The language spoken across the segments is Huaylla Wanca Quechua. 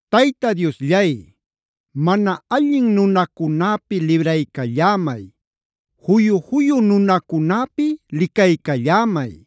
Tayta Diosllay, mana allin nunacunäpi libraycallämay. Juyu-juyu nunacunäpi licaycallämay.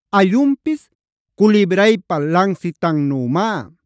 Allunpis culibraypa lansitannümá.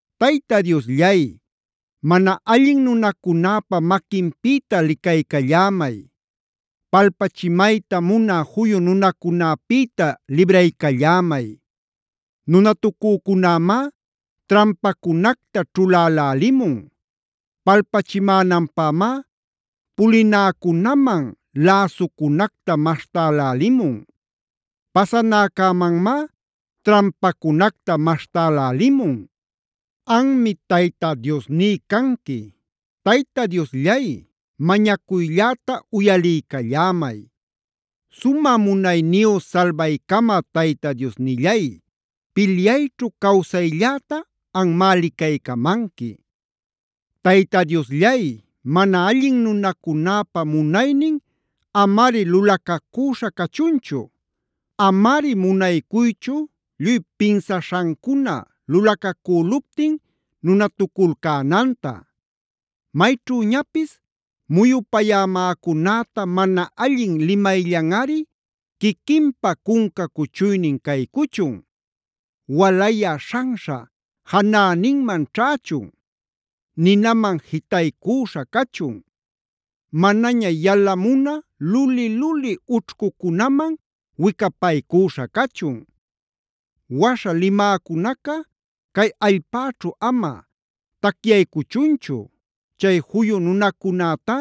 Tayta Diosllay, mana allin nunacunäpa maquinpïta licaycallämay. Palpachimayta munä juyu nunacunäpïta libraycallämay. Nunatucucunämá trampacunacta ćhulälälimun. Palpachimänanpämá pulinäcunaman läsucunacta maśhtälälimun. Pasanäcämanmá trampacunacta maśhtälälimun. Anmi Tayta Diosní canqui. Tayta Diosllay, mañacuylläta uyaliycallämay. Sumä munayniyu salbaycamä Tayta Diosnillay, pilyayćhu cawsaylläta anmá licaycamanqui. Tayta Diosllay, mana allin nunacunäpa munaynin amari lulacacüśha cachunchu. Amari munaycuychu lluy pinsaśhancuna lulacacüluptin nunatuculcänanta. Mayćhüñapis muyupayämäcunäta mana allin limayllanꞌari quiquinpa cunca cuchuynin caycuchun. Walayä śhanśha janäninman ćhächun. Ninaman jitaycuśha cachun. Manaña yalamunä luli-luli ućhcucunaman wicapaycüśha cachun. Waśha limäcunaca cay allpäćhu ama tacyaycuchunchu; chay juyu nunacunätá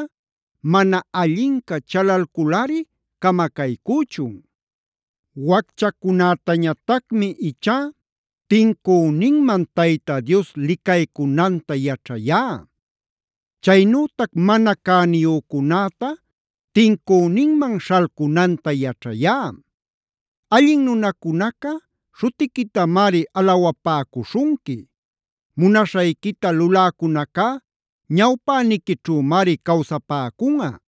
mana allinca chalalculꞌari camacaycüchun. Wacchacunätañatacmi ichá tincüninman Tayta Dios licaycunanta yaćhayá. Chaynütac mana cäniyücunäta tincüninman śhalcunanta yaćhayá. Allin nunacunaca śhutiquitamari alawapäcuśhunqui. Munaśhayquita luläcunacá ñawpäniquićhümari cawsapäcunꞌa.